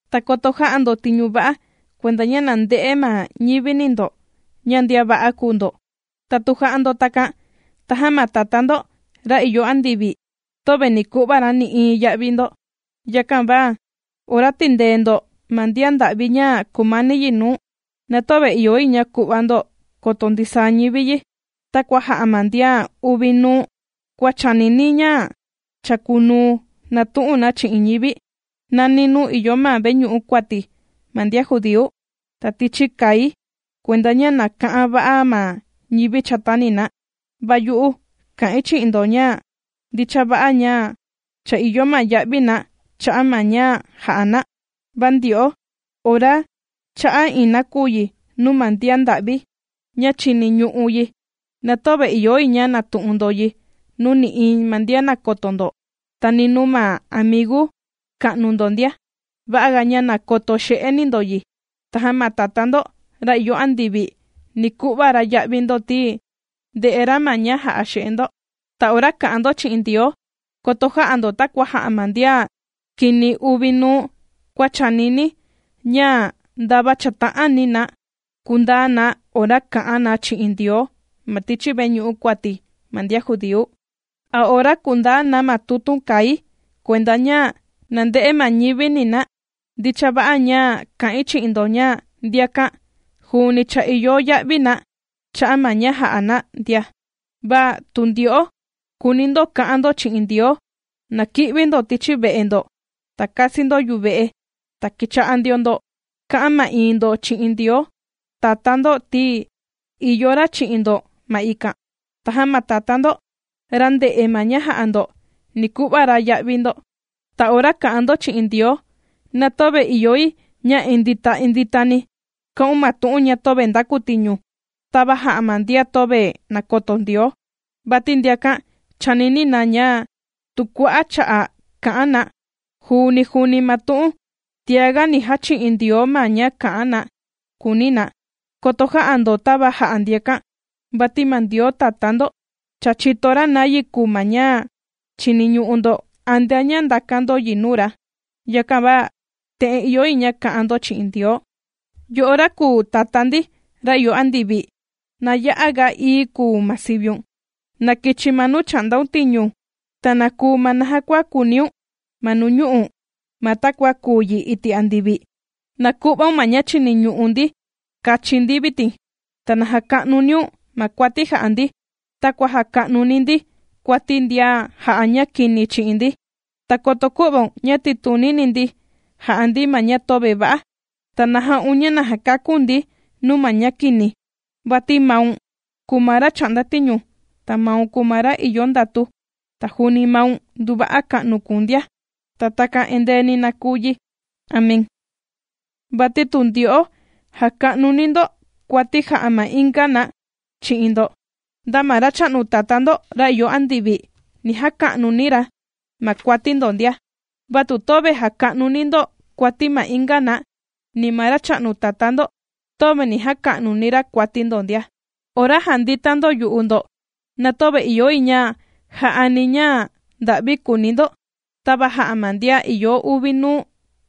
’Ta koto jä'a ndo tiñu va'a kuenda ña na nde'e ma ñivini ndo ña ndian va'a kùu ndo. Ta tu jà'a ndo takan tajan ma Tatá ndo, ra ìyo andivi, töve ni ku'va ra nï'iin ya'vi ndo. Yakan va ora tìndee ndo ma ndian nda'vi ña kumani yi nuu, na töve ìyo yi ña ku'va ndo koto ndisaa ñivi yi, takua jà'a ma ndian uvi nuu kua chànini ña chàkunuu nàtu'un na chi'in ñivi, nani nuu ìyo ma veñu'u kuati ma ndian judíu, ta tichi kai, kuenda ña na ka'an va'a ma ñivi chatani na. Va yu'u kà'in chi'in ndo ña ndicha va'a ña cha ìyo ma ya'vi na cha'a' ma ña jà'a na. Va ndyo'o ora chà'a iin nakuyi nuu ma ndian nda'vi ña chìniñu'u yi, na töve ìyo yi ña natu'un ndo yi nuu nï'iin ma ndian nàkoto ndo, ta ni nuu ma amigu ka'nu ndo ndia. Va'aga ña na koto xe'eni ndo yi. Tajan ma Tatá ndo ra ìyo andivi ni ku'va ra ya'vi ndo, ti ndè'e ra ma ña jà'a xe'e ndo. ’Ta ora kà'an ndo chi'in Ndioo, koto jä'a ndo takua jà'a ma ndian kini uvi nuu kua chànini ña ndava chàta'ani na kundaa na ora kà'an na chi'in Ndioo ma tichi veñu'u kuati ma ndian judíu, a ora kundaa na ma tutun kai kuenda ña na nde'e ma ñivini na. Ndicha va'a ña kà'in chi'in ndo ña, ndiakan juuni cha ìyo ya'vi na cha'a' ma ña jà'a na ndia. Va tu ndyo'o kùuni ndo ka'an ndo chi'in Ndioo, na ki'vi ndo tichi ve'e ndo, ta kasi ndo yuve'e, ta kicha'a ndio ndo ka'an ma'iin ndo chi'in Ndioo Tatá ndo, ti ìyo ra chi'in ndo ma ikan. Tajan ma Tatá ndo, ra ndè'e ma ña jà'a ndo, ni ku'va ra ya'vi ndo. ’Ta ora kà'an ndo chi'in Ndioo, na töve ìyo yi ña indita inditani kā'un ma tu'un töve ndakutiñu, tava jà'a ma ndian töve nàkoto Ndioo. Vati ndiakan chànini na, ña tu kua'a' cha'a' kà'an na, juuni juuni ma tu'un, tiaga ni jachi'in Ndioo ma ña kà'an na, kùuni na. Koto jä'a ndo tava jà'a ndiakan, vati ma Ndioo Tatá ndo, cha chìto ra nayi kùu ma ña chiniñu'u ndo antea ña ndàkan ndo yi nuu ra. Yakan va te'en ìyo yi ña ka'an ndo chi'in Ndioo: Yo'o ra kùu Tatá ndi, ra ìyo andivi, na ya'aga ií kùu ma siviun. Na kichi ma nuu chà'ndaun tiñu. Ta na kuu ma naja kua kùuniun ma nuñu'u', ma takua kùu yi iti' andivi. Na ku'vaun ma ña chìniñu'u ndi kachi ndi vitin. Na jàka'nuniun ma kuati jà'a ndi, takua jàka'nuni ndi kuati ma ndian jà'a ña kini chi'in ndi. Ta koto kü'vaun ña titunini ndi jà'a ndi ma ña töve va'a. Va na ja'un ña na kaku̱n ndi nuu ma ña kini. Vati maun kùu ma ra chà'nda tiñu, ta maun kùu ma ra ìyo ndatu, ta juuni maun nduva'a ka'nu kùu̱n ndia. Ta takan endeeni na kùu yi. Amén. ’Vati tu ndyo'o jàka'nuni ndo kuati jà'a ma inga na chi'in ndo, nda ma Racha'nu Tatá ndo ra ìyo andivi, ni jaka'nuni ra ma kuati ndo ndia. Va tu töve jàka'nuni ndo kuati ma inga na, ni ma Racha'nu Tatá ndo, töve ni jaka'nuni ra kuati ndo ndia. ’Ora jàndita ndo yu'u ndo, na töve ìyo yi ña ja'ani ña nda'vi kuuni ndo, tava jà'a ma ndian ìyo uvi nuu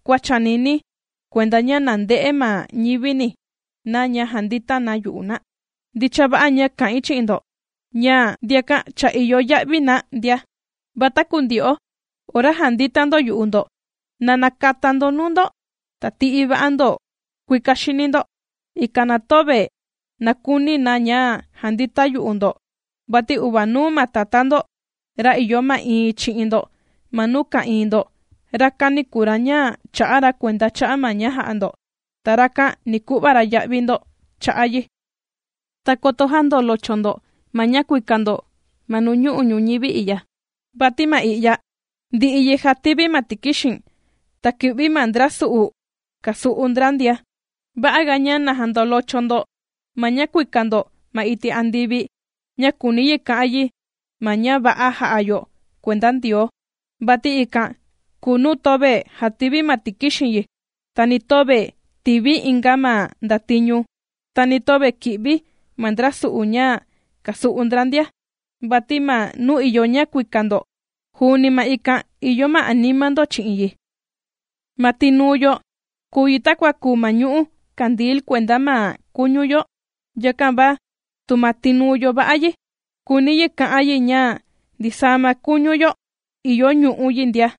kua chànini, kuenda ña na nde'e ma ñivini na ña jàndita na yu'u na. Ndicha va'a ña kà'in chi'in ndo ña, ndiakan cha ìyo ya'vi na ndia. Va taku ndyo'o ora jàndita ndo yu'u ndo, na nakata ndo nuu ndo, ta tì'i va'a ndo kuika xini ndo, ikan na töve nakuni na ña jandita yu'u ndo. Vati uvanuu ma Tatá ndo ra ìyo ma'iin chi'in ndo ma nuu ka'ìin ndo, rakani kùu ra ña chà'a ra kuenda cha'a' ma ña jà'a ndo, ta rakan ni ku'va ra ya'vi ndo cha'a' yi. ’Ta koto jändolocho ndo ma ña kuika ndo ma nuñu'u' ñuñivi i'ya, vati ma i'ya, ndi'i yi jàtivi ma tikixin, ta kì'vi ma ndra su'u, kasu'u ndra ndia. Va'aga ña na jandolocho ndo ma ña kuika ndo ma iti' andivi ña kùuni yi ka'an yi ma ña va'a jà'a yo kuenda Ndioo, vati ikan kùu nuu töve jàtivi ma tikixin yi, ta ni töve tìvi inga ma ndatiñu, ta ni töve kì'vi ma ndra su'u ña, kàsu'u ndra ndia. Vati ma nuu ìyo ña kuika ndo, juuni ma ikan ìyo ma anima ndo chi'in yi. ’Ma tinuu yo, kùu yi takua kùu ma ñu'ú kandil kuenda ma kuñu yo. Yakan va tu ma tinuu yo va'a yi, kùuni yi ka'an yi ña ndisaa ma kuñu yo ìyo ñu'ú yi ndia.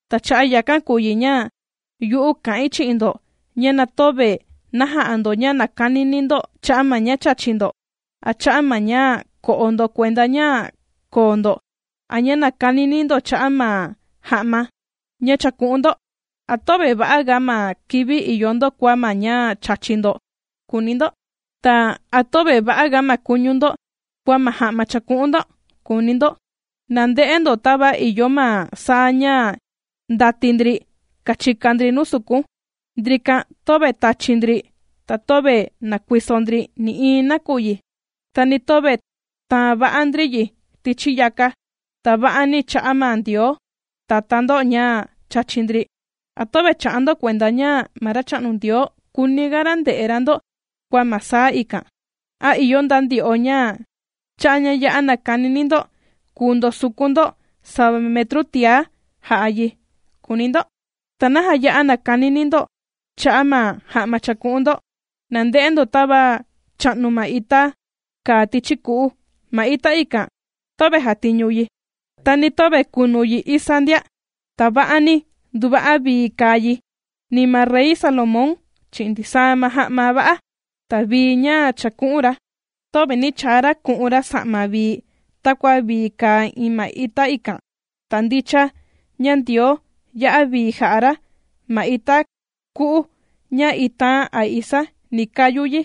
―Ta cha'a' yakan kùu yi ña yu'u kà'in chi'in ndo ña na töve na ja'a ndo ña nàkanini ndo cha'a' ma ña chàchi ndo, a cha'a' ma ña ko'o ndo kuenda ña koo ndo, a ña nakanini ndo cha'a' ma ja'ma ña chàku'un ndo. ¿A töve va'aga ma kivi ìyo ndo kua ma ña chàchi ndo?, kùuni ndo. Ta, ¿a töve va'aga ma kuñu ndo, kua ma ja'ma chàku'un ndo?, kùuni ndo. Na nde'e ndo tava ìyo ma saa ña ndàti ndri kàchika ndri nuu sukun. Ndrikan töve tàchi ndri, ta töve nàkuiso ndri nï'iin nakuyi, ta ni töve tàan va'a ndri yi tichi yaka, ta va'ani chà'a ma Ndioo Tatá ndo ña chàchi ndri. ¿A töve chà'a ndo kuenda ña ma Racha'nu Ndioo kùuniga ra nde'e ra ndo kua ma saa ikan? ¿A ìyo nda ndyo'o ña cha'a' ña ya'a nakanini ndo kùu ndosukun ndo sava metru tiá, jà'a yi?, kùuni ndo. ’¿Ta naja ya'a nàkanini ndo cha'a' ma ja'ma chàku'un ndo? Na nde'e ndo tava chà'nu ma ita kàa tichi ku'u. Ma ita ikan töve jàtiñu yi, ta ni töve kunu yi isa ndia, ta va'ani nduva'a vii kàa yi, ni ma rey Salomón, chi'in ndisaa ma ja'ma va'a, ta vii ña chàku'un ra, töve nī chaa ra ku'un ra ja'ma vii takua vii kàa iin ma ita ikan. Ta ndicha ña Ndioo ya'a vii jà'a ra ma ita ku'u ña itaan a isaa ni kayu yi.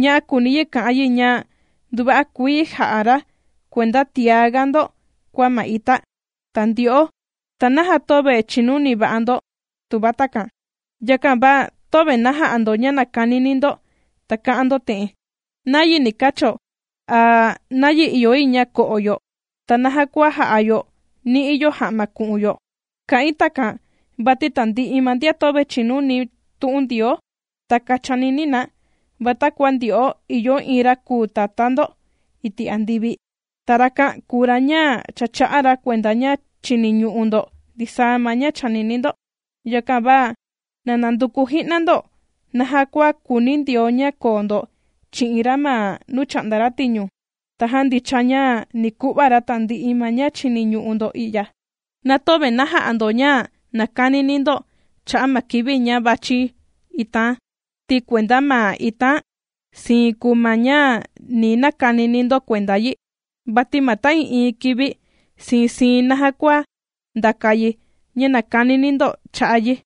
Ña'á kùuni yi ka'an yi ña nduva'a kuii ja'a ra kuenda tiaga ndo kua ma ita. Ta ndyo'o, ¿ta naja töve chìnuni va'a ndo?, tuva takan. Yakan va töve na ja'a ndo ña nàkanini ndo ta kà'an ndo te'en: “¿Nayi ni kacho?” a “¿Nayi ìyo yi ña ko'o yo?” ta “¿Naja kua jà'a yo ni'i yo ja'ma ku'un yo?” Kà'in takan, vati tandi'i ma ndian töve chìnuni tu'un Ndioo, takan chànini na, va takua ndyo'o ìyo iin ra kùu Tatá ndo iti' andivi, ta rakan kùu ra ña cha chà'a ra kuenda ña chìniñu'u ndo ndisaa ma ña chànini ndo. Yakan va na nanduku ji'na ndo naja kua kùuni Ndioo ña koo ndo chi'in ra ma nuu chà'nda ra tiñu, tajan ndicha ña ni ku'va ra tandi'i ma ña chìniñu'u ndo i'ya. Na töve na ja'a ndo ña nàkanini ndo cha'a' ma kivi ña vàchi itaan, ti kuenda ma itaan, siin kùu ma ña ni nakanini ndo kuenda yi. Vati ma ta'ii'iin kivi siin siin naja kua ndàka yi, ña nàkanini ndo cha'a' yi.